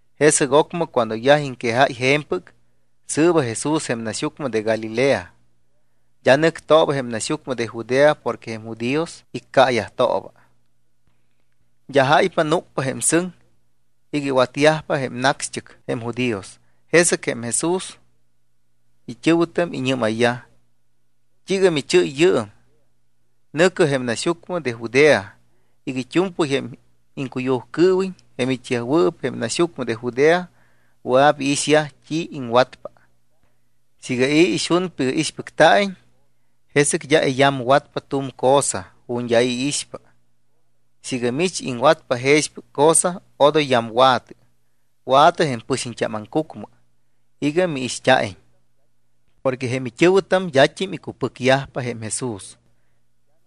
Jesɨc ocmɨ cuando yaj iŋquejáy je̱mpɨc, sɨɨba Jesús jém naxyucmɨ de Galilea. D́a nɨctooba jém naxyucmɨ de Judea porque jém judíos iccaayajtooba. D́a jáypa núc jém sɨŋ iga iwatyajpa jém nacxt́ɨc jém judíos. Jesɨc jém Jesús it́ɨ̱wɨtam iñɨ́mayyaj: —¿T́iiga michɨ́y yɨɨm? Nɨ̱cɨ jém naxyucmɨ de Judea iga it́u̱mpɨy jém iŋcuyujcɨɨwiñ jém it́yajwɨɨp jém naxyucmɨ de Judea wɨa̱p iixyaj t́i iŋwatpa. Siiga i̱ ixunpa iga ixpɨcta̱iñ, jesɨc d́a iyamwatpa tu̱m cosa ju̱t́ d́a i̱ iixpa. Siiga mich iŋwatpa jexpɨc cosa, odoy yamwa̱tɨ. Wa̱tɨ jém pɨxiñt́am aŋcucmɨ iga miixt́a̱iñ. Porque jém it́ɨ̱wɨtam d́at́im icupɨcyajpa jém Jesús.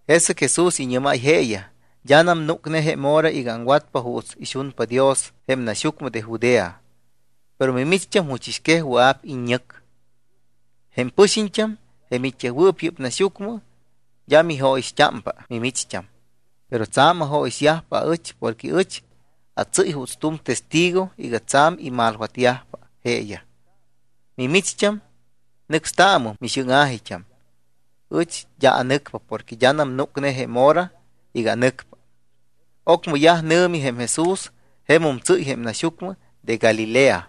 Jesɨc Jesús iñɨ́máy jeeyaj: —D́anam núcne jém hora iga aŋwatpa juuts ixunpa Dios jém naxyucmɨ de Judea. Pero mimicht́am juchɨs quej wɨa̱p iññɨc. Jém pɨxiñt́am, jém it́yajwɨɨp yɨ́p naxyucmɨ, d́a mijóyixt́ámpa mimicht́am. Pero tsa̱m ajóyixyajpa aɨch porque ɨch atsɨ́y juuts tu̱m testigo iga tsa̱m imalwatyajpa jeeyaj. Mimicht́am, nɨcstaamɨm mixɨ́ŋa̱jit́am. Ɨch d́a anɨcpa porque d́anam núcne jém hora iga anɨcpa. Ocmɨ yaj nɨ̱mi jém Jesús, jemum tsɨ́y jém naxyucmɨ de Galilea.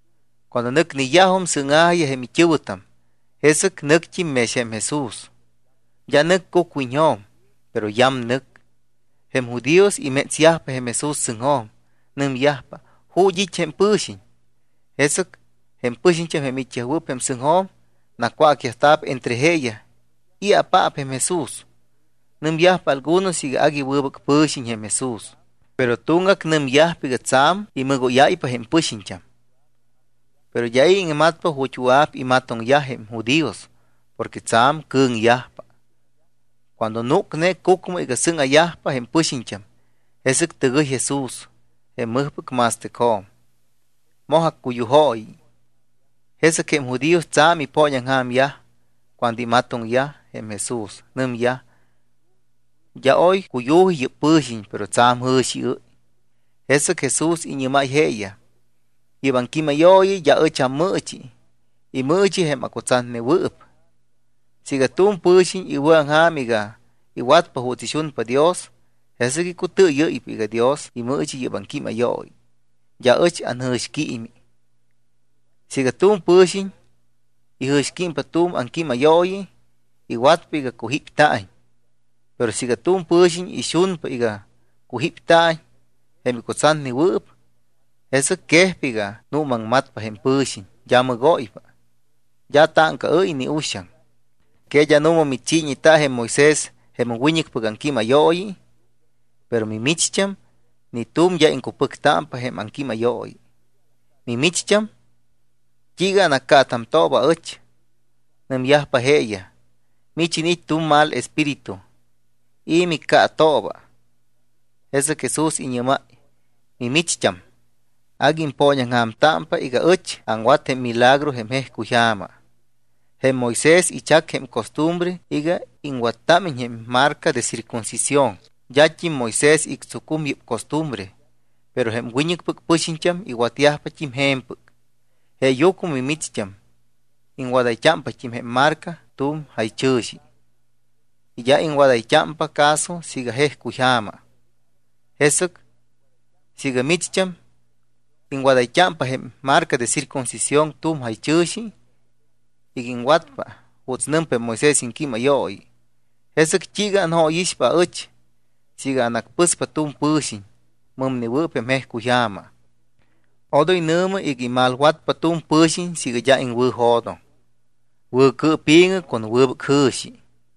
Cuando nɨcyajum sɨ́ŋa̱jiyaj jém it́ɨ̱wɨtam, jesɨc nɨct́im mex jém Jesús. D́a nɨc cucwiñjo̱m, pero yamnɨc. Jém judíos imétsyajpa jém Jesús sɨŋjo̱m. Nɨmyajpa: —¿Ju̱t́ it́ jém pɨ̱xiñ? Jesɨc jém pɨxiñt́am jém it́yajwɨɨp jém sɨŋjo̱m nacwácyajta̱p entre jeeyaj i̱apaap jém Jesús. Nɨmyajpa algunos iga agui wɨbɨc pɨ̱xiñ jém Jesús. Pero tuŋgac nɨmyajpa iga tsa̱m imɨgóyáypa jém pɨxiñt́am. Pero d́a i̱ iŋmatpa ju̱t́ wɨa̱p imatoŋyaj jém judíos porque tsa̱m cɨ̱ŋyajpa. Cuando núcne cucmɨ iga sɨŋa̱yajpa jém pɨxiñt́am, jesɨc tɨgɨy Jesús jém mɨjpɨc ma̱stɨcjo̱m. Moj accuyujooyi. Jesɨc jém judíos tsa̱m ipooñaŋja̱myaj cuando imatoŋyaj jém Jesús. Nɨmyaj: —D́a oy cuyu̱ji yɨ́p pɨ̱xiñ, pero tsa̱m jɨ̱xiɨ́y. Jesɨc Jesús iñɨ́máy jeeyaj: —Yɨ́p aŋquímayooyi d́a ɨch ammɨɨchi. Imɨɨchi jém acutsatnewɨɨp. Siiga tu̱m pɨ̱xiñ iwɨ̱aŋja̱m iga iwatpa juuts ixunpa Dios, jesɨc icutɨɨyɨ́ypa iga Dios imɨɨchi yɨ́p aŋquímayooyi, d́a ɨch anjɨ̱xquiimi. Siiga tu̱m pɨ̱xiñ ijɨ̱xquímpa tu̱m aŋquímayooyi, iwatpa iga cujípta̱iñ. Pero siiga tu̱m pɨ̱xiñ ixunpa iga cujípta̱iñ jém icutsatnewɨɨp, jesɨc quejpa iga nuumaŋmatpa jém pɨ̱xiñ, d́a mɨgóypa, d́a táŋcaɨ́y ni uxaŋ. ’¿Que d́a nu̱ma michiiñeta jém Moisés jém wiñɨcpɨc aŋquímayooyi? Pero mimicht́am, ni tu̱m, d́a iŋcupɨctámpa jém aŋquímayooyi. Mimicht́am, ¿t́iiga anaccaatamtooba aɨch? Nɨmyajpa jeeyaj: —Mich iniit́ tu̱m mal espíritu. ¿I̱ miccaatooba? Jesɨc Jesús iñɨ́máy: —Mimicht́am agui impooñaŋja̱mtámpa iga ɨch aŋwat jém milagro jém jejcuy ja̱ma. Jém Moisés ichac jém costumbre iga iŋwattámiñ jém marca de circuncisión. D́at́im Moisés ictsucum yɨ́p costumbre, pero jém wiñɨcpɨc pɨxiñt́am iwatt́im je̱mpɨc. Jeeyucmɨ mimicht́am iŋwadayt́ámpat́im jém marca tu̱m jaychɨ̱xi y d́a iŋwadayt́ámpa caso siiga jejcuy ja̱ma. Jesɨc siiga mimicht́am iŋwadayt́ámpa jém marca de circuncisión tu̱m jaychɨ̱xi iga iŋwatpa juuts nɨmpa jém Moisés iŋquímayooyi, ¿jesɨc t́iiga anjóyixpa aɨch siiga anacpɨspa tu̱m pɨ̱xiñ mɨmnewɨɨp jém jejcuy ja̱ma? Odoy nɨ̱mɨ iga imalwatpa tu̱m pɨ̱xiñ siiga d́a iŋwɨ̱jo̱doŋ. Wɨ̱cɨɨpi̱ŋɨ con wɨbɨc jɨ̱xi.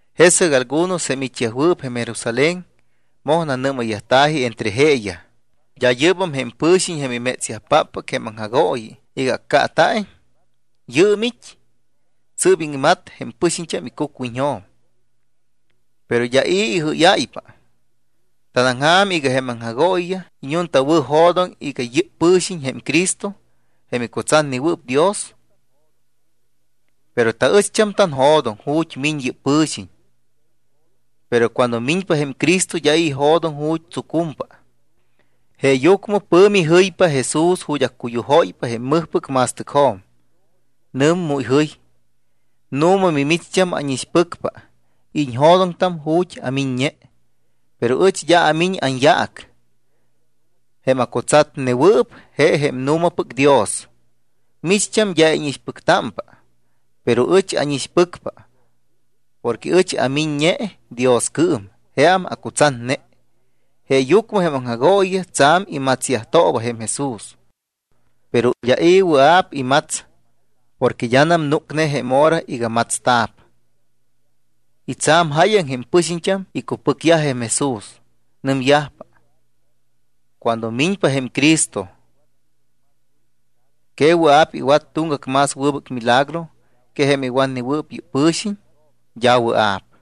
Jesɨc algunos jém it́yajwɨɨp jém Jerusalén moj nanɨ́mayyajta̱ji entre jeeyaj: —¿D́a yɨ́bam jém pɨ̱xiñ jém imétsyajpáppɨc jém aŋjagooyiyaj iga accaata̱iñ? Yɨɨm it́. Sɨ́p iŋmat jém pɨxiñt́am icucwiñjo̱m. Pero d́a i̱ ijɨ́yáypa. ¿Tanaŋja̱m iga jém aŋjagooyiyaj iñuntawɨ̱jo̱doŋ iga yɨ́p pɨ̱xiñ jém Cristo jém icutsatnewɨɨp Dios? Pero taɨcht́am tanjo̱doŋ ju̱t́ miñ yɨ́p pɨ̱xiñ. Pero cuando miñpa jém Cristo d́a i̱ ijo̱doŋ ju̱t́ tsucumpa. Jeeyucmɨ pɨ̱mi jɨypa Jesús ju̱t́ accuyujóypa jém mɨjpɨc ma̱stɨcjo̱m, nɨm mu ijɨy: —Nu̱ma micht́am ánixpɨcpa y iñjo̱doŋtam ju̱t́ amiññe, pero ɨch d́a amiñ anyaac. Jém acutsatnewɨɨp je jém nu̱mapɨc Dios, micht́am d́a íñixpɨctámpa. Pero ɨch ánixpɨcpa porque ɨch amiññe Dioscɨɨm, jeam acutsatne. Jeeyucmɨ jém aŋjagooyiyaj tsa̱m imatsyajtooba jém Jesús. Pero d́a i̱ wɨa̱p imats porque d́anam núcne jém hora iga matsta̱p. Y tsa̱m jáyaŋ jém pɨxiñt́am icupɨcyaj jém Jesús. Nɨmyajpa: —Cuando miñpa jém Cristo, ¿que wɨa̱p iwat tuŋgac más wɨbɨc milagro que jém iwatnewɨɨp yɨ́p pɨ̱xiñ? D́a wɨa̱p.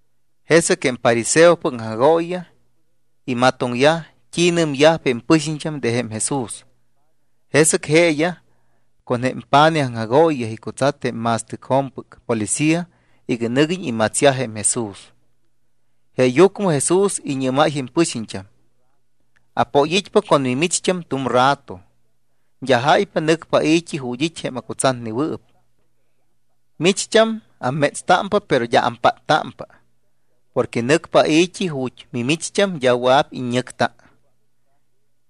Jesɨc jém fariseopɨc aŋjagooyiyaj imatoŋyaj t́i nɨmyajpa jém pɨxiñt́am de jém Jesús. Jesɨc jeeyaj con jém pa̱nij aŋjagooyiyaj icutsat jém ma̱stɨcjo̱mpɨc policía iga nɨguiñ imatsyaj jém Jesús. Jeeyucmɨ Jesús iñɨ́máy jém pɨxiñt́am: —Apoyit́pa con mimicht́am tu̱m rato. D́a jáypa nɨcpa ai̱t́i ju̱t́ it́ jém acutsatnewɨɨp. Micht́am ammétstámpa, pero d́a ampáttámpa porque nɨcpa ai̱t́i ju̱t́ mimicht́am d́a wɨa̱p iññɨcta.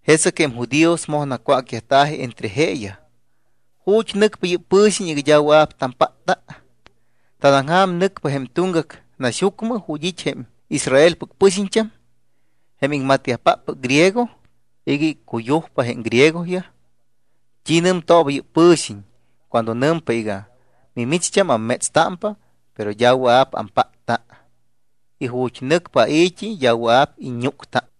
Jesɨc jém judíos moj nacwácyajta̱ji entre jeeyaj: —¿Ju̱t́ nɨcpa yɨ́p pɨ̱xiñ iga d́a wɨa̱p tampátta? ¿Tanaŋja̱m nɨcpa jém tuŋgac naxyucmɨ ju̱t́ it́ jém Israelpɨc pɨxiñt́am jém iŋmatyajpáppɨc griego iga iccuyujpa jém griegoyaj? ¿T́i nɨmtooba yɨ́p pɨ̱xiñ cuando nɨmpa iga: “Micht́am ammétstámpa, pero d́a wɨa̱p ampátta y ju̱t́ nɨcpa ai̱t́i, d́a wɨa̱p iññúcta”?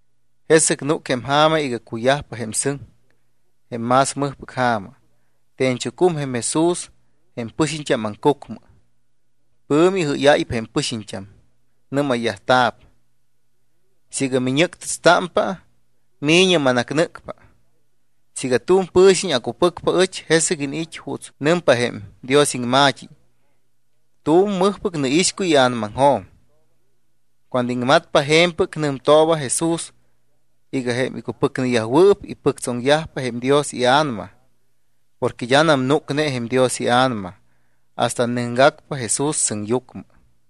Jesɨc núc jém ja̱ma iga cuyajpa jém sɨŋ, jém más mɨjpɨc ja̱ma. Te̱ñchucum jém Jesús jém pɨxiñt́am aŋcucmɨ. Pɨ̱mi ijɨ́yáypa jém pɨxiñt́am, nɨ́mayyajta̱p: —Siiga miñɨ́ctɨtstámpa, mi̱ñɨ manacnɨ́cpa. Siiga tu̱m pɨ̱xiñ acupɨcpa aɨch, jesɨc iniit́ juuts nɨmpa jém Dios iŋma̱t́i: “Tu̱m mɨjpɨc nɨixcuy ia̱namaŋjo̱m.” Cuando iŋmatpa je̱mpɨc, nɨmtooba Jesús iga jém icupɨcneyajwɨɨp, ipɨctsoŋyajpa jém Dios iA̱nama. Porque d́anam núcne jém Dios iA̱nama hasta nɨcgacpa Jesús sɨŋyucmɨ.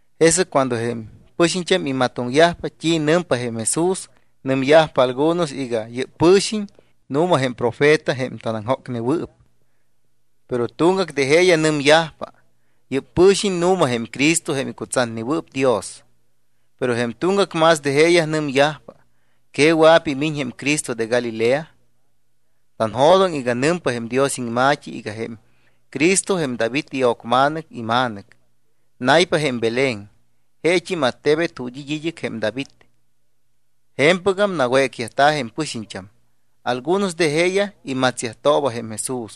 Jesɨc cuando jém pɨxiñt́am imatoŋyajpa t́i nɨmpa jém Jesús, nɨmyajpa algunos iga: “Yɨ́p pɨ̱xiñ nu̱ma jém profeta jém tanaŋjócnewɨɨp.” Pero tuŋgac de jeeyaj nɨmyajpa: —Yɨ́p pɨ̱xiñ nu̱ma jém Cristo jém icutsatnewɨɨp Dios. Pero jém tuŋgac más de jeeyaj nɨmyajpa: —¿Que wɨa̱p imiñ jém Cristo de Galilea? Tanjo̱doŋ iga nɨmpa jém Dios iŋma̱t́i iga jém Cristo jém David io̱cma̱nɨc ima̱nɨc. Naypa jém Belén, jeet́im attebet ju̱t́ it́ id́ɨc jém David. Je̱mpɨgam nawécyajta̱ jém pɨxiñt́am. Algunos de jeeyaj imatsyajtooba jém Jesús,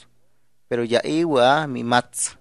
pero d́a i̱ wɨa̱ mimats.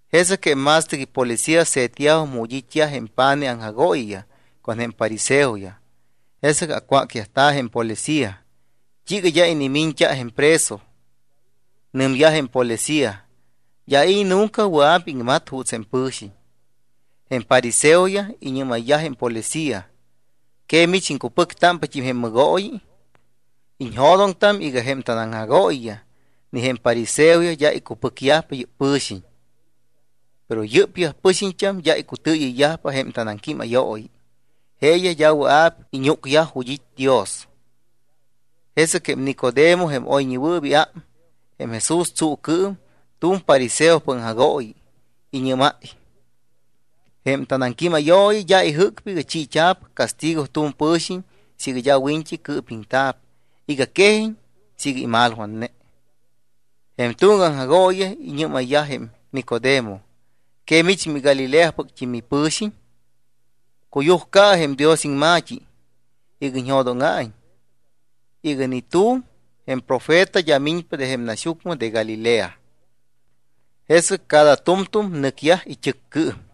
Jesɨc jém ma̱stɨc ipolicía se̱tyajum ju̱t́ it́yaj jém pa̱nij aŋjagooyiyaj con jém fariseoyaj. Jesɨc acwácyajta̱ jém policía: —¿T́iiga d́a inimiñt́a jém preso? Nɨmyaj jém policía: —D́a i̱ nunca wɨa̱p iŋmat juuts jém pɨ̱xiñ. Jém fariseoyaj iñɨ́mayyaj jém policía: —¿Que mich iŋcupɨctámpat́im jém mɨgooyi? Iñjo̱doŋtam iga jém tanaŋjagooyiyaj ni jém fariseoyaj d́a icupɨcyajpa yɨ́p pɨ̱xiñ. Pero yɨ́pyaj pɨxiñt́am d́a icutɨɨyɨyyajpa jém tanaŋquímayooyi, jeeyaj d́a wɨa̱p iñúcyaj ju̱t́ it́ Dios. Jesɨc jém Nicodemo, jém oyñewɨɨp iám jém Jesús tsuucɨɨm, tu̱m fariseopɨc aŋjagooyi, iñɨ́máy: —Jém tanaŋquímayooyi d́a ijɨ́cpa iga chiit́a̱p castigo tu̱m pɨ̱xiñ siiga d́a wiñt́i cɨɨpiŋta̱p iga quejiñ siiga imalwatne. Jém tuŋgac aŋjagooyiyaj iñɨ́mayyaj jém Nicodemo: —¿Que mich miGalileapɨct́im mipɨ̱xiñ? Cuyujcaɨ jém Dios iŋma̱t́i iga iñjo̱dóŋa̱iñ iga ni tu̱m jém profeta d́a miñpa de jém naxyucmɨ de Galilea. Jesɨc cada tu̱mtu̱m nɨcyaj it́ɨccɨɨm.